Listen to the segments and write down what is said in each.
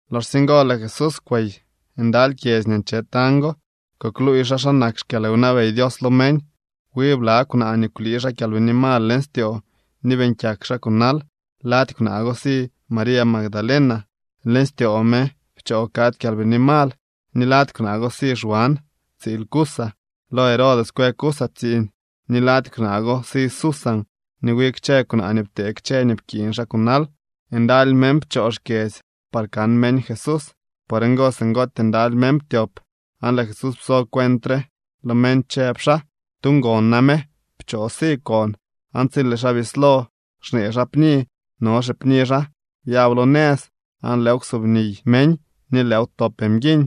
Loxsye ngo lëë Jesús kwey ndaly kyedzy nii nche tañ go, kukluuy xaa xa nak xkyalwnabey Dios lo meñ. Wi bla kwnaa nii kwlii xaa kyalbini mal leñ styoo ni beeñ kyak xaa kunal. Lady kwnaa go si María Magdalena. Leñ styoo me pchoo kadzy kyalbini mal. Ni lady kwnaa go si Xwan, tsiil Cuza. Lo Herodes kwë Cuza tsiiñ. Ni lady kwnaa go si Susan, ni wi kchë kwnaa nii ptee kchë nii pkiiñ xaa kunal. Ndaly meñ pchoo xkyedzy par kan meñ Jesús. Por ngo singootyee ndaly meñ ptyop, aan lëë Jesús pso cuent re lo meñ, chëb xaa: —Tu ngon name pchoo si kon. Aan tsi lëë xaa bislo xnee xaa pni, no xipni xaa byab lo nëz, aan lëëw ksubniy meñ ni lëëw ptop mguiñ.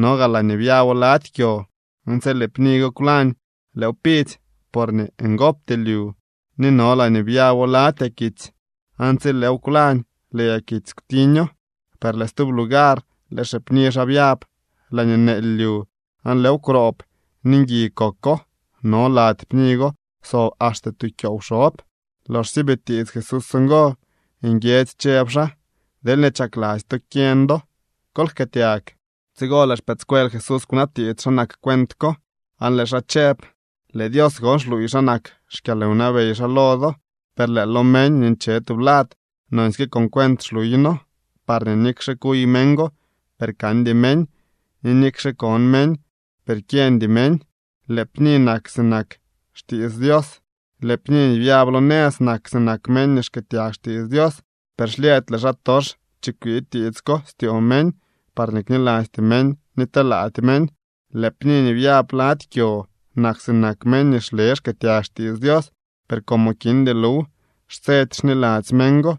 No gaa laañee byabo lady kyo, aan tsi lëë pni go kwlañ, lëëw pidzy, porñee ngopty lyu. Ni no laañee byabo lady yakitsy, aan tsi lëëw kwlañ, lëë yakitsy kwtiño. Per lëë stub lugar lëë xipni xaa byab laañee neely lyu, aan lëëw kwroob ni ngui koko. No lady pni go kwsob axte tu kyoow xob. Loxsye bitiits Jesús ngo, nguiedzy chëb xaa: —Deelñee chakladzy to kyeñ do, kol jkëëtyag. Tsigo lëë xpëëdscuel Jesús kwnabtiits xa nak cuent ko, aan lëë xaa chëb: —Lëë Dios gon xluuy xa nak xkyalwnabey xaa lo do, per lëë lo meñ nii nche tublad nonsyke con cuent xluyno, parñee nikxe kuy meñ, per kandy meñ, ni nikxe kon meñ, per kyeñdy meñ. ’Lëë pni nak sinak xtiits Dios. Lëë pni nii byab lo nëz nak sinak meñ nii xkëëtyag xtiits Dios, per xlyëëdy lëë xaatox chikwii tiits ko styoo meñ, parñee knilasty meñ ni telaady meñ. Lëë pni nii byab lady kyo nak sinak meñ nii xle xkëëtyag xtiits Dios, per como kindy luw, xtsedy xniladzy meñ go,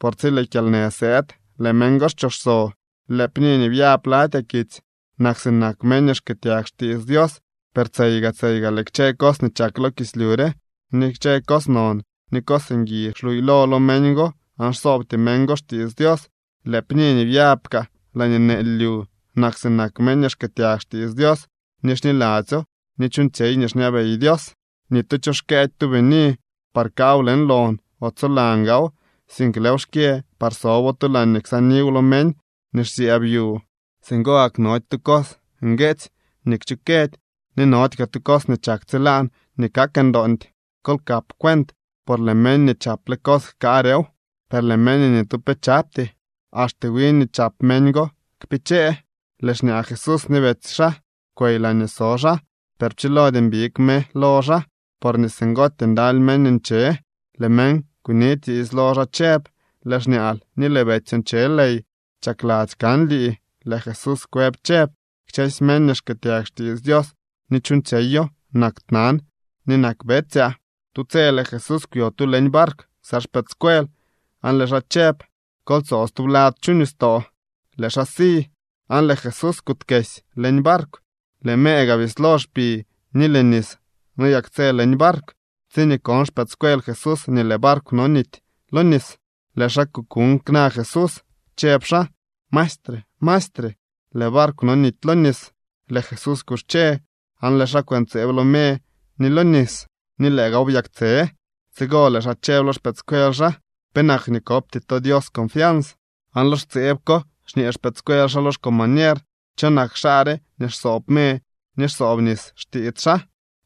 por tsi lëë kyalnë sëëd lëë meñ go xchooxso. Lëë pni nii byab lady yakitsy nak sinak meñ nii xkëëtyag xtiits Dios, per tseyga tseyga lëë kchë cos nii chak lo kislyu re, ni kchë cos non ni cos ngui xluuylo lo meñ go aan xsoobty meñ go xtiits Dios. Lëë pni nii byaab kaa laañee neely lyu nak sinak meñ nii xkëëtyag xtiits Dios ni xniladzyo ni chuuñtsyey nii xñabey Dios. ’Ni tu cho xkëëdy tu bini par kaaw leñ lon o tsolan gaaw, sink lëëw xkyë par sobo tu laañee ksaaniw lo meñ nii xsyëëb yu. Singo gak nody tu cos ngueetsy nii kchukëdy, ni nody kaa tu cos nii chak tsilaan nii kak ndoondy. ’Kol kap cuent, por lëë meñ nii chaple cos jkaarew. Per lëë meñ nii ni tu pe chapty, axte nii wiñ nii chap meñ go kpichee. Lëë xñaa Jesús ni betsy xaa kwey laañee so xaa, per pchilody mbig me lo xaa, porñee singootyee ndaly meñ nche. Lëë meñ kunitiits lo xaa chëb: —Lëë xñaal ni lëë betsyoo nche ley, chakladzy kan lii. Lëë Jesús kwëb chëb: —Kchësy meñ nii xkëëtyag xtiits Dios ni chuuñtsyeyo nak tnan ni nak betsyaa. Tu tse lëë Jesús kwyo tu leñ barkw ksa xpëëdscuel, aan lëë xaa chëb: —Kol tsoo stublad chu nistoo. Lëë xaa si, aan lëë Jesús kuutkesy leñ barkw. Lëë me gaa bislo xpi ni lëë nis noyaktsë leñ barkw. Tsiñee kon xpëëdscuel Jesús nii lëë barkw nonity lo nis, lëë xaa kukuuñ kna Jesús, chëb xaa: —¡Maestre! ¡Maestre! ¡Lëë barkw nonity lo nis! Lëë Jesús kuxche, aan lëë xaa kwëntseeb lo me ni lo nis, ni lëë gaaw byaktse. Tsigo lëë xaa chëb lo xpëëdscuel xaa: —¿Penak nii kopty to Dios confians? Aan lo xtseeb ko xñee xpëëdscuel xaa lo xcombañer: —¿Cho nak xaa re nii xsoob me ni xsoob nis xtiits xaa?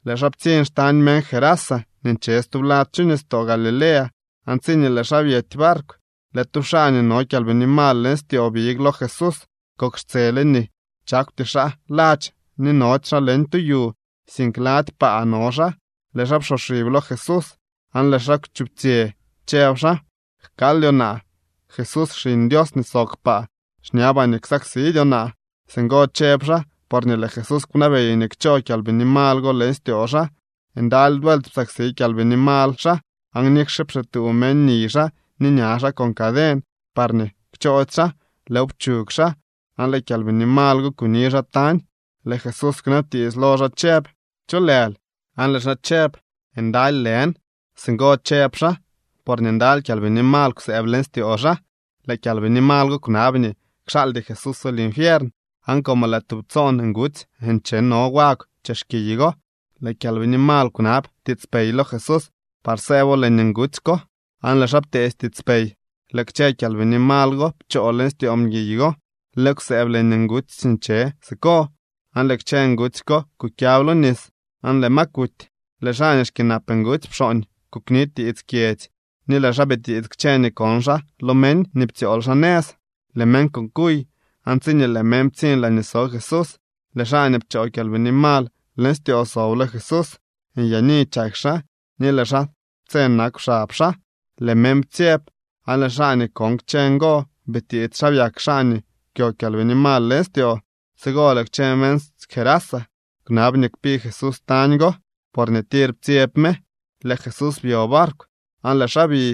Lëë xaa ptsiñ xtañ meñ Gerasa nii nche stublad chu nistoo Galilea. Aan tsiñee lëë xaa byety barkw, lëë tu xaa nii no kyalbini mal leñ styoo big lo Jesús. Kok xtsele nii chakwty xaa ladx ni nody xaa leñ tu yu, sink lady paa no xaa. Lëë xaa psoxib lo Jesús, aan lëë xaa kwchuptsyë, chëb xaa: —Jkaaldyoo naa, Jesús, Xiñ Dios nii sob kpaa. Xñabaa nii ksaksidyoo naa. Singo chëb xaa porñee lëë Jesús kwnabey nii kchoo kyalbini mal go leñ styoo xaa. Ndaly vuelt psaksi kyalbini mal xaa, aan nikxe pxituu meñ niy xaa ni ña xaa con caden parñee kchoody xaa, lëëw pchug xaa, aan lëë kyalbini mal go kuni xaa tañ. Lëë Jesús kwnabtiits lo xaa chëb: —¿Cho lël? Aan lëë xaa chëb: —Ndaly lën. Singo chëb xaa porñee ndaly kyalbini mal kwsëëb leñ styoo xaa. Lëë kyalbini mal go kwnab nii kxaaldy Jesúso linfiern. Aan como lëë tub tsoon ngutsy ncheno wagw chex kiy go, lëë kyalbini mal kwnab tiitspey lo Jesús par sëëbo leñ ngutsy ko. Aan lëë xaa pteedy tiitspey. Lëë kchë kyalbini mal go pchoo leñ styoo mguiy go, lëëw kwsëëb leñ ngutsy nii nche siko, aan lëë kchë ngutsy ko kukyab lo nis, aan lëë ma kuty. Lëë xaa nii xkyënap ngutsy pxooñ, kukni tiits kyedzy ni lëë xaa bitiits kchë nii kon xaa lo meñ nii ptsyool xaa nëz. Lëë meñ kukuy aan tsiñee lëë meñ ptsiñ laañee so Jesús, lëë xaa nii pchoo kyalbini mal leñ styoo sob lo Jesús. Nyaani chak xaa ni lëë xaa tse nakw xab xaa. Lëë meñ ptsyeb. Aan lëë xaa nii kon kchë ngo bitiits xa byak xaa nii kwyo kyalbini mal leñ styoo. Tsigo lëë kchë meñ Gerasa kwnab nii kpi Jesús tañ go, porñee tir ptsyeb me. Lëë Jesús byo barkw aan lëë xaa bi.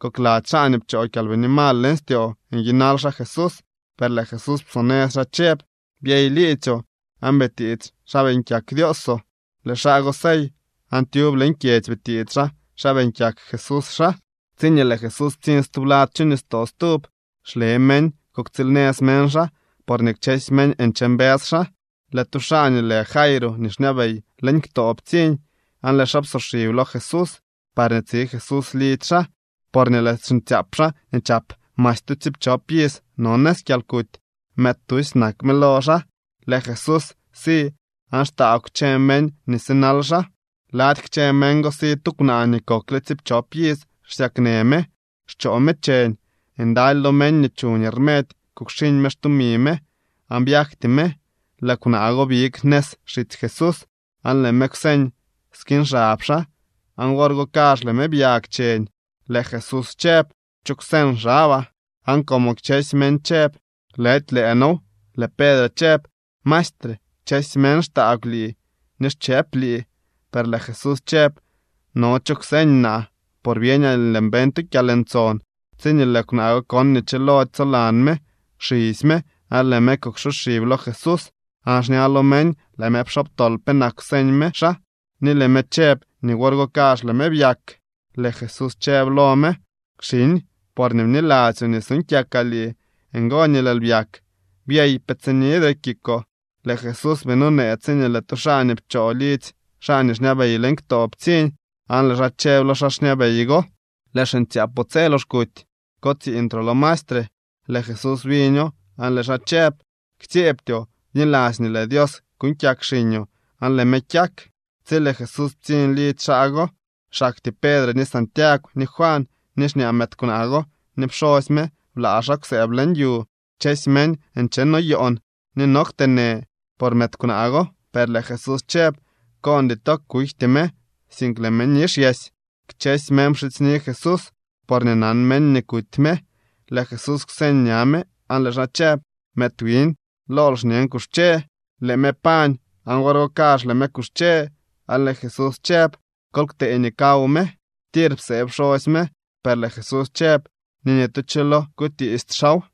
Kokladzy xaa nii pchoo kyalbini mal leñ styoo nyinal xaa Jesús, per lëë Jesús psonëz xaa chëb: —Byey liidzyoo, aan bitiits xa beeñ kyak Dioosoo. Lëë xaa go sey aan tyub leñ kyedzy bitiits xaa xa beeñ kyak Jesús xaa. Tsiñee lëë Jesús ptsiñ stublad chu nistoo stub, xle meñ kuktsiilnëz meñ xaa, porñee kchësy meñ nche mbës xaa. Lëë tu xaa nii lë Jairo nii xñabey leñ ktoo ptsiñ, aan lëë xaa psoxib lo Jesús parñee tsi Jesús lidzy xaa, porñee lëë xiñtsyaap xaa nii chap masy tu tsiipchop iz no nëz kyalkuty. Mëëd tusy nak me lo xaa. Lëë Jesús si aan xtaagw kchë meñ nii sinal xaa. Lady kchë meñ go si tu kwnaa nii kokle tsiipchop iz xsyaknë me, xchoo me cheñ. Ndaly lo meñ nii chuñ rmedy kukxiñ me xtumi me aan byagty me. Lëë kwnaa go big nëz xitsy Jesús aan lëë me kwseñ skiñ xab xaa, aan wor go kazh lëë me byag cheñ. Lëë Jesús chëb: —¿Cho kwseñ xabaa? Aan como kchësy meñ chëb: “Lëdy lëë noow”, lëë Pedre chëb: —Maestre, kchësy meñ xtaagw lii ni xchëëp lii. Per lëë Jesús chëb: —No cho kwseñ naa, por byeñaa nii lëën beñ tu kyalntson. Tsiñee lëë kwnaa go kon nii chilody tsolan me, xisy me aan lëë me kuksoxib lo Jesús. Aan xña lo meñ lëë me pxobtol penak kwseñ me xaa ni lëë me chëb nii wor go kazh lëë me byak. Lëë Jesús chëb lo me: —Xiñ, porñee bniladzyoo nii suuñ kyakaa lii, ngo nii lëël byak. Byey, pe tsinidre kikoo. Lëë Jesús bii nonee tsiñee lëë tu xaa nii pchoo lidzy xaa nii xñabey leñ ktoo ptsiñ, aan lëë xaa chëb lo xaa xñabey go: —Lëë xiñtsyaapoo tse lox kuty. Kotsiiñtroo lo maestre. Lëë Jesús biño, aan lëë xaa chëb: —Ktsyeebtyoo. Bniladzy nii lëë Dios kuuñ kyak xiñoo aan lëë me kyak. Tsi lëë Jesús ptsiñ lidzy xaa go, xaktyee Pedre, ni Santiagw, ni Juan, ni xñaa mëëd kwnaa go ni pxosy me blaa xaa kwsëëb leñ yu. Kchësy meñ nchenoyoon ni no kteenë por mëëd kwnaa go, per lëë Jesús chëb: —Koondy to. Kujty me, sink lëë me nixyesy. Kchësy meñ pxidzyni Jesús, porñee nan meñ nii kuty me. Lëë Jesús kwseñ ña me aan lëë xaa chëb: —Mëëd wiñ, lool xñen, kuxche. Lëë me pañ aan wor go kazh lëë me kuxche, aan lëë Jesús chëb: —Kol ktee nii kaw me. Tir psee pxosy me, per lëë Jesús chëb nii ni tu cho lo kutiisty xaaw.